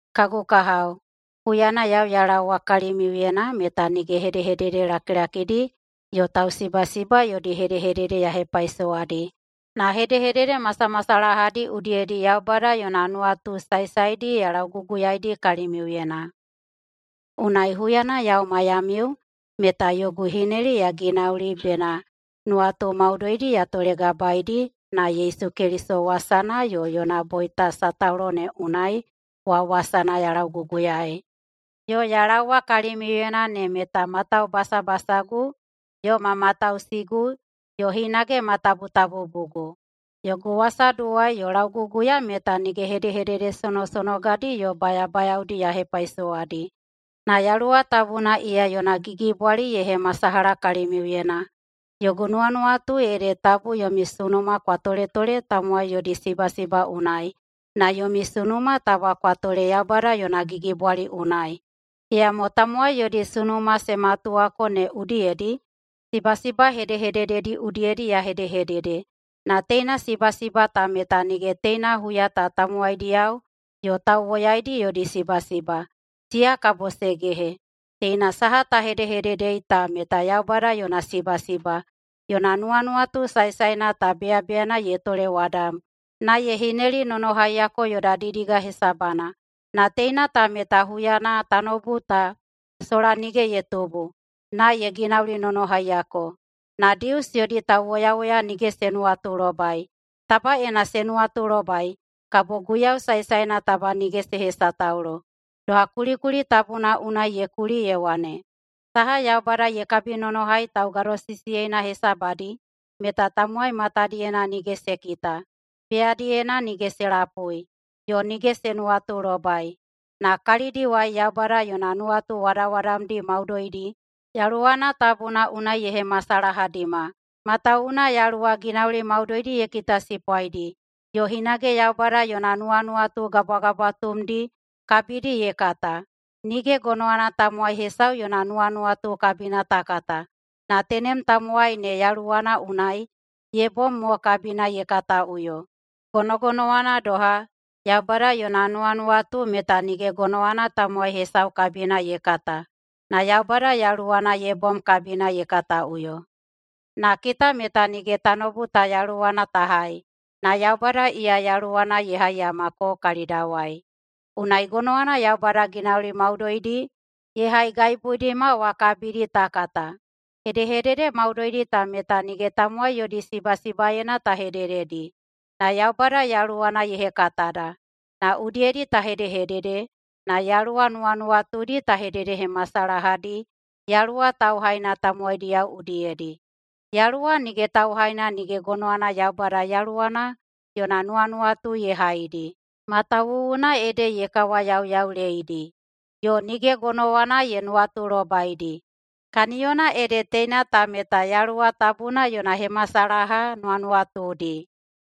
Kagu kahao, huyana yau ya laowa kalimiuyena meta nige hedehedede lakilakidi yo tausibasiba yodi hedehedede ya hepaisowadi, na hedehedede masamasalahadi udiyedi Yaubada yona nuwatu saesaedi ya lauguguyaeidi kalimiuyena. Unai huyana yau maiyamiu meta yogu hineli ya ginauli bena nuwatu maudoidi ya tolegabaedi na Yesu Keliso wasana yo yona boita sataulo ne unai wa wasana ya lauguguyaei. Yo ya laowa kalimiuyena ne meta ma taubasabasagu, yo ma matausigu, yo hinage ma tabutabubugu. Yogu wasaduwai yo lauguguya meta nige hedehedede sonosonogadi yo bayabayaodi ya hepaisowadi, na Yaluwa Tabuna iya yona gigibwali ye hemasalaha kalimiuyena. Yogu nuwanuwatu ede tabu yomi sunuma kwa toletole tamowai yodi sibasiba unai, na yomi sunuma taba kwa tole Yaubada yona gigibwali unai. Iyamo tamowai yodi sunuma se matuwako ne udiyedi sibasiba hedehedededi udiyedi ya hedehedede. Na teina sibasiba ta meta nige teina huya ta tamowaidiyao yo tauwoyaidi yodi sibasiba, siya kabo se gehe. Teina saha ta hedehededei ta meta Yaubada yona sibasiba. Yona nuwanuwatu saesaena ta beyabeyana ye tolewadam na ye hinelinonohaiyako yoda didiga hesabana. Na teina ta meta huyana tanoubu ta sola nige ye tubu na ye ginaulinonohaiyako. Na Dius yodi tauwoyawoya nige se nuwatulobai. Taba ena se nuwatulobai kabo Guiyau saesaena taba nige se hesataulo. Doha kulikuli tabuna unai ye kuli ye wane, “Saha Yaubada ye kabinonohai taugadosisiyeina hesabadi meta tamowai matadiyena nige se kita, beyadiyena nige se lapui, yo nige se nuwatulobai.” Na kalidawai Yaubada yona nuwatu wadawadamdi maudoidi Yaluwana Tabuna unai ye hemasalahadima. Matawuwuna Yaluwa ginauli maudoidi ye kitasipwaidi, yo hinage Yaubada yona nuwanuwatu gabwagabwatumdi kabidi ye kata. Nige gonowana tamowai hesau yona nuwanuwatu kabina ta kata, na tenem tamowai ne yaluwana unai ye bom mo kabina ye kataꞌuyo. Gonogonowana doha, Yaubada yona nuwanuwatu meta nige gonowana tamowai hesau kabina ye kata, na Yaubada Yaluwana ye bom kabina ye kataꞌuyo. Na kita meta nige tanoubu ta yaluwana ta hai, na Yaubada iya Yaluwana ye haiyamako kalidawai. Unai gonowana Yaubada ginauli maudoidi ye haigaibuidima wa kabidi ta kata. Hedehedede maudoidi ta meta nige tamowai yodi sibasibaena ta hedededi, na Yaubada Yaluwana ye hekatada na udiyedi ta hedehedede na Yaluwa nuwanuwatudi ta hededehemasalahadi Yaluwa tauhaina tamowaidiyao udiyedi. Yaluwa nige tauhaina nige gonowana Yaubada Yaluwana yona nuwanuwatu ye haidi, matawuwuna ede ye kawayauyauleidi. Yo nige gonowana ye nuwatulobaidi, kaniyona ede teina ta meta Yaluwa Tabuna yona hemasalaha nuwanuwatudi.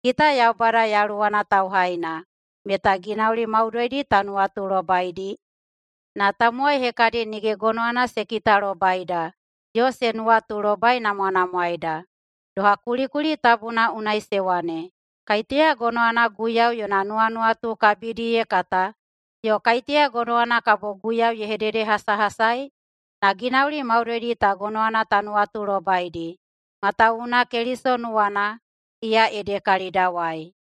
Kita Yaubada Yaluwana tauhaina meta ginauli maudoidi ta nuwatulobaidi, na tamowai hekadi nige gonowana se kitalobaida yo se nuwatulobainamwanamwaeida. Doha kulikuli tabuna unai se wane, “Kaiteya gonowana Guiyau yona nuwanuwatu kabidi ye kata yo kaiteya gonowana kabo Guiyau ye hededehasahasai?” Na ginauli maudoidi ta gonowana ta nuwatulobaidi matawuwuna Keliso nuwana, iya ede kalidawai.